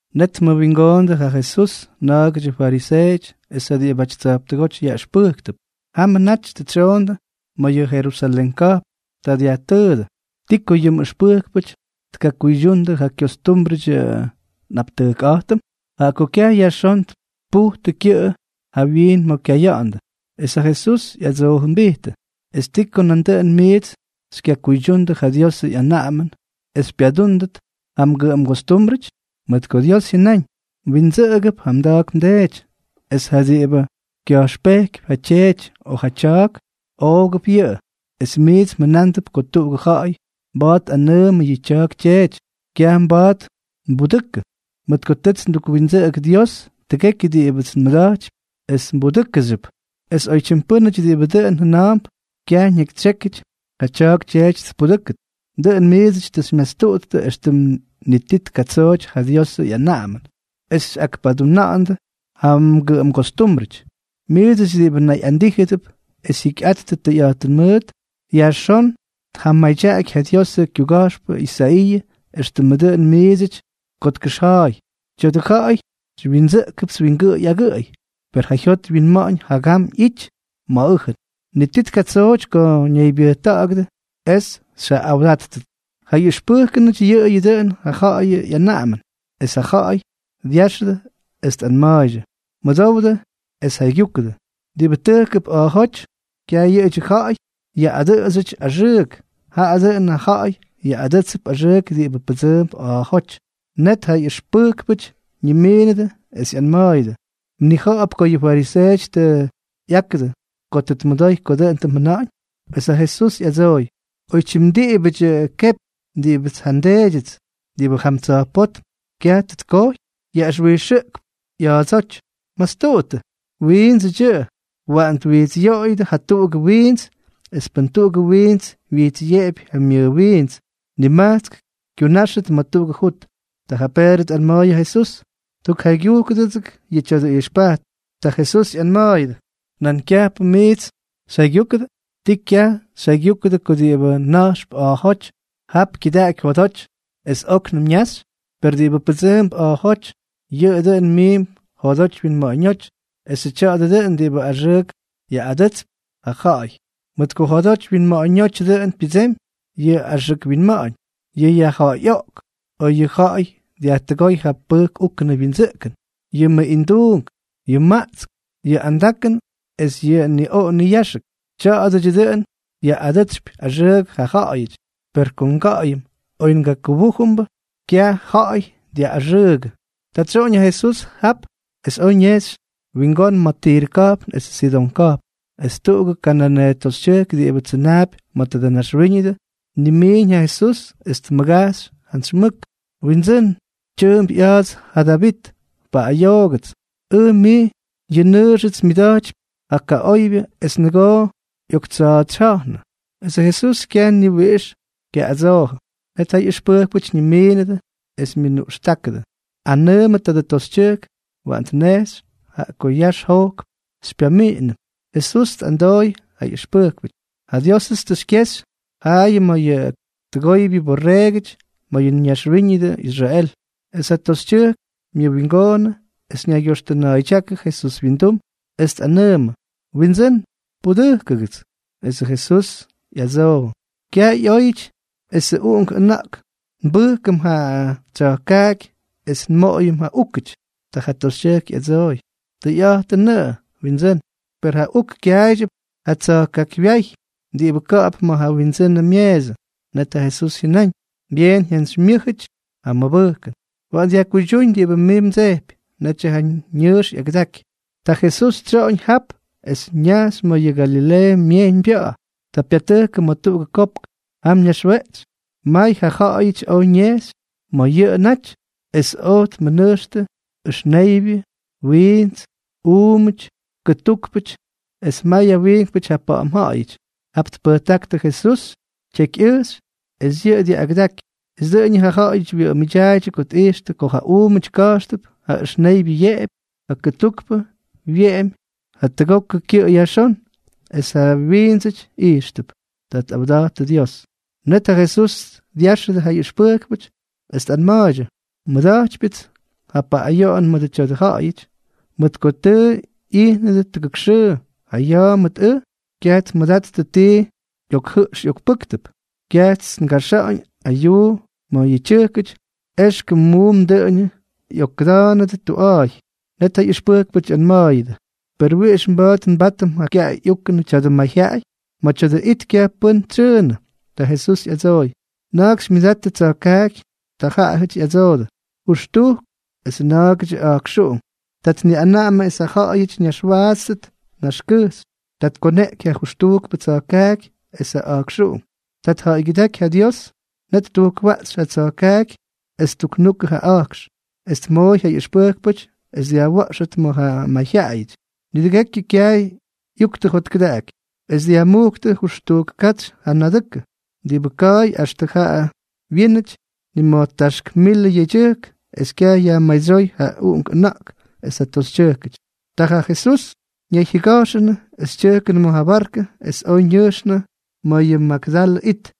Net tmʉwingoondʉ ja Jesús na̱a̱gʉdyʉ fariseeʉty es ja diꞌibʉty tsa̱jptʉgóty yaꞌʉxpʉjktʉp. Jamʉ naty tʉ tsyoondʉ ma̱ yʉ Jerusalén ka̱jpn. Ta dyajtʉʉdʉ: —¿Ti ko yʉ mꞌʉxpʉjkpʉty tkakuydyundʉ ja kyostúmbrʉdyʉ nꞌaptʉjkꞌa̱jtʉm?, jaꞌa ko kyaj yajxón tpujtʉ kyʉꞌʉ jawyiin ma̱ kyaya̱ꞌa̱ndʉ. Es ja Jesús ꞌyadsoojʉmbijtʉ: —¿Es ti ko nandʉꞌʉn miits xykyakuydyundʉ ja Diosʉ ꞌyanaꞌamʉn es xypyadúndʉt ja mgʉꞌʉmgostúmbrʉty? Mʉt ko Dios jyʉnáñ: “Mwindsʉꞌʉgʉp ja mda̱a̱k mdeety”, es “ja diꞌibʉ kya̱jxpejkypy yʉ tyeety o yʉ tya̱a̱k, oogʉp yʉꞌʉ.” Es miits mjʉnándʉp ko tuꞌugʉ ja̱ꞌa̱y mba̱a̱t tꞌanʉʉmʉ yʉ tya̱a̱k tyeety: “Kyaj mba̱a̱t nbudʉkʉ, mʉt ko tʉts ndukwindsʉꞌʉgʉ Dios tʉgekyʉ diꞌibʉts nmʉda̱jtypy es mbudʉ́kʉxyʉp.” Es oytyim pʉ́nʉty diꞌibʉ dʉꞌʉn jʉna̱a̱mp, kyaj ñakytsyékyʉty ja tya̱a̱k tyeety tpudʉ́kʉt. Dʉꞌʉn miidsʉty tʉ xymyastuꞌuttʉ éxtʉm ni ti tkatsooty ja Diosʉ ꞌyanaꞌamʉn es xyꞌakpaduna̱ꞌa̱ndʉ ja mgʉꞌʉmgostúmbrʉty. Miidsʉty diꞌibʉ nayꞌandíjʉdʉp es jyikyꞌattʉ tʉyꞌa̱jtʉn mʉʉt, yajxón tjamadyaky ja Diosʉ kyuga̱jxpʉ Isaiiʉ éxtʉmʉ dʉꞌʉn miidsʉty ko tkʉxja̱a̱y: Tya̱dʉ ja̱ꞌa̱y xywyindsʉꞌkʉpts wingʉꞌʉy agʉꞌʉy, per ja jyot wyinma̱ꞌa̱ñ jagam ꞌyity ma̱ ʉjʉn. Ni ti tkatsooty ko ñaybyʉjta̱ꞌa̱gʉdʉ es xyjaꞌꞌawdáttʉts. Ja ꞌyʉxpʉjkʉnʉty yʉꞌʉyʉ dʉꞌʉn ja ja̱ꞌa̱yʉ ꞌyanaꞌamʉn. Es ta ja ja̱ꞌa̱y dyáxʉdʉ es tꞌanma̱a̱ydyʉ: —Mʉdowdʉ es jaygyúkʉdʉ. Diꞌibʉ tʉjkʉp a̱a̱jóty, kyaj yʉꞌʉdyʉ ja̱ꞌa̱y yaꞌꞌadʉꞌʉdsyʉty axʉʉk. Jaꞌa dʉꞌʉn ja ja̱ꞌa̱y yaꞌꞌadʉ́tsʉp axʉʉk diꞌibʉ pʉdsʉʉmp a̱a̱jóty. Net ja ꞌyʉxpʉjkpʉty ñimiinʉdʉ es ꞌyanma̱a̱yʉdʉ: —¿Mnija̱ꞌa̱p ko yʉ fariseeʉty tʉ ꞌyákʉdʉ ko tʉ tmʉdoy ko dʉꞌʉn tʉ mjʉna̱ꞌa̱ñ? Es ja Jesús ꞌyadsooy: —Oytyim diꞌibʉdyʉ kepy diꞌibʉts ja nDeedyʉts diꞌibʉ jam tsa̱jpótm kyaj tʉ tkojy, yaꞌʉxwijxʉꞌkp ꞌya̱a̱dsóty. Mastuꞌuttʉ. Wiindsʉdyʉꞌʉ. Waꞌan twijtsꞌyoꞌoyʉdʉ jatuꞌugʉ wiints. Es pʉn tuꞌugʉ wiints wyijtsꞌyeꞌepy ja myʉwiints, nimajtsk kyunáxtʉt ma̱ tuꞌugʉ jut. Ta yʉ Peedrʉ tꞌanma̱a̱y ja Jesús: —Tukjaygyujkʉdʉgʉts yʉ tya̱dʉ ijxpajtʉn. Ta Jesús ꞌyanma̱a̱yʉdʉ: —¿Nan kyajpʉ miits xyjaygyúkʉdʉ? ¿Tii kyaj xyjaygyúkʉdʉ ko diꞌibʉ na̱jxp a̱a̱jóty, jap kyʉdaꞌaky jodoty es óknʉm ñaxy? Per diꞌibʉ pʉdsʉʉmp a̱a̱jóty, yʉꞌʉ dʉn miimp jodoty winma̱ꞌa̱ñóty, esʉ tya̱a̱dʉ dʉꞌʉn diꞌibʉ axʉʉk yaꞌꞌadʉtsypy ja ja̱ꞌa̱y. Mʉt ko jodoty winma̱ꞌa̱ñótyʉ dʉꞌʉn pyʉdsemy yʉ axʉk winma̱ꞌa̱ñ, yʉ yajja̱ꞌa̱yꞌoꞌk, ko yʉ ja̱ꞌa̱y dyajtʉgóy ja pʉjk úkʉnʉ wyindsʉꞌkʉn, yʉ mʉꞌinduunk, yʉ maꞌtsk, yʉ andakʉn es yʉ niꞌoꞌo niyáxʉk. Tya̱a̱dʉdyʉ dʉꞌʉn yaꞌꞌadʉtsypy axʉʉk ja ja̱ꞌa̱yʉty, per ko nga̱ꞌa̱yʉm, oy ngakʉbújʉmbʉ, kyaj ja̱ꞌa̱y dyaꞌꞌaxʉʉgʉ. Ta tsyoꞌoñ ja Jesús jap es oj ñejxy wingón ma̱ Tirʉ ka̱jpn esʉ Sidón ka̱jpn. Es tuꞌugʉ kananeeʉ toxytyʉjk diꞌibʉ tsʉnaapy ma̱ tadʉ naxwíñʉdʉ, tnimiiñ ja Jesús, es tmʉgajxy jantsy mʉk: —¡Windsʉ́n, tyʉʉmp ꞌya̱a̱ts ja Davit, paꞌꞌayoogʉts ʉj mij! Yʉ nnʉʉxʉts myʉda̱jtypy ja kaꞌoybyʉ es nʉgoo ꞌyoktsa̱a̱tsyja̱jnʉ. Esʉ Jesús kyaj ni wiꞌix kyaꞌꞌadsoojʉ. Net ja ꞌyʉxpʉjkpʉty ñimiinʉdʉ, es myʉnuꞌxtákʉdʉ: —Anʉʉmʉ tadʉ toxytyʉjk waꞌan tnejxy, jaꞌa ko yax jojkp xypyamiꞌinʉm. Jesús tꞌadsooy ja ꞌyʉxpʉjkpʉty: —Ja Diósʉts tʉ xykyexy jaayʉ ma̱ yʉ tʉgoybyʉ borreegʉty ma̱ yʉ naxwíñʉdʉ Israel. Es ja toxytyʉjk myʉwingoonʉ es ñaygyoxtʉna̱a̱ydyákʉ Jesús wyindum, es tꞌanʉʉmʉ: —¡Windsʉ́n, pudʉjkʉgʉts! Esʉ Jesús ꞌyadsoojʉ: —Kyaj ꞌyóyʉty esʉ uꞌunk ʉna̱ꞌk nbʉjkʉm ja tsya̱jkaaky es nmoꞌoyʉm ja úkʉty. Ta ja toxytyʉjk ꞌyadsooy: —Tʉyꞌa̱jtʉnʉꞌʉ, Windsʉ́n. Per ja uk kyaaydyʉp ja tsa̱jkaakywyáy diꞌibʉ ka̱ꞌa̱p ma̱ ja wyindsʉnʉ myeesʉ. Net ja Jesús jyʉnáñ: —¡Byeen jyantsymyʉ́jʉty ja mmʉbʉjkʉn! Waꞌan dyajkuydyúñ diꞌibʉ mij mdsejpy. Netyʉ ja ñʉʉx ꞌyagʉdaky. Ta Jesús tsyoꞌoñ jap es ñajxy ma̱ yʉ Galileeʉ Myejyñbya̱ꞌa̱. Ta pyatʉjkʉ ma̱ tuꞌugʉ kopk. Jam ñaxweꞌtsy. May ja ja̱ꞌa̱yʉty oj ñejxy ma̱ yʉꞌʉ naty, es oj tmʉnʉjxtʉ ʉxneybyʉ, wiints, uumʉty, kʉtúkpʉty, es mayʉ wiinkpʉty ja pa̱ꞌa̱m ja̱ꞌa̱yʉty. Jap tpʉjtáktʉ Jesús tyekyꞌʉjxy es yʉꞌʉ dyaꞌꞌagʉdaky. Es dʉꞌʉñʉ ja ja̱ꞌa̱yʉty wyʉꞌʉmʉdyaaydyʉ ko tꞌijxtʉ ko ja uumʉty ka̱jxtʉp, ja ʉxneybyʉ yeꞌepy, ja kʉtukpʉ wyeꞌemy jatʉgokʉ kyʉꞌʉ yajxón, es ja wiindsʉty ijxtʉp. Ta tꞌawdattʉ Dios. Net ja Jesús dyáxʉdʉ ja ꞌyʉxpʉjkpʉty, es tꞌanma̱a̱ydyʉ: —Nmʉda̱jtypyʉts ja paꞌꞌayoꞌon mʉdʉ tya̱dʉ ja̱ꞌa̱yʉty, mʉt ko tʉ ꞌyijnʉdʉ tʉgʉk xʉʉ ja ya̱a̱ mʉt ʉj es kyaj tmʉdattʉ ti ꞌyokjʉꞌx ꞌyokpʉ́ktʉp. Kyajts ngaxa̱ꞌa̱ñ ayuu ma̱ yʉ tyʉjkʉty, éxkʉm muum dʉꞌʉñʉ ꞌyokkʉda̱a̱nʉdʉ tuꞌa̱a̱y. Net ja ꞌyʉxpʉjkpʉty ꞌyanma̱a̱yʉdʉ: —¿Per wiꞌix mba̱a̱t nbátʉm ja kyaꞌay ꞌyúkʉnʉ tya̱dʉ mayjyaꞌay? Ma̱ tya̱dʉ it kyaj pʉ́n tsyʉʉnʉ. Ta Jesús ꞌyadsooy: —¿Na̱a̱k xymyʉdattʉ tsa̱jkaaky? Ta jaꞌajʉty ꞌyadsoodʉ: —Jʉxtujk, es na̱a̱gʉdyʉ a̱jkxuꞌunk. Ta tniꞌanaꞌamʉ es ja ja̱ꞌa̱yʉty ñaxwaatstʉt naxkʉjxy. Ta tkoneꞌky ja jʉxtujkpʉ tsa̱jkaaky es ja a̱jkxuꞌunk. Ta tja̱ꞌa̱ygyʉdáky ja Dios. Net ttujkwaꞌxy ja tsa̱jkaaky es ttuknukʉ ja a̱jkx, es tmooy ja ꞌyʉxpʉjkpʉty es dyajwa̱ꞌxʉt ma̱ ja mayjyaꞌayʉty. Nidʉgekyʉ kyaay ꞌyuktʉ jotkʉdaꞌaky, es dyajmujktʉ jʉxtujk katsy ja nadʉkʉ. Diꞌibʉ ka̱a̱y uktʉ jaꞌa wyínʉty nima̱jtáxk milʉ yedyʉjk, es kyaj yajmadsyóy ja ʉna̱ꞌkuꞌunk es ja toxytyʉjkʉty. Ta ja Jesús ñayjyʉga̱jxʉnʉ, es tyʉjkʉnʉ ma̱ ja barkʉ es oj ñʉjxnʉ ma̱ yʉ Magdalʉ it.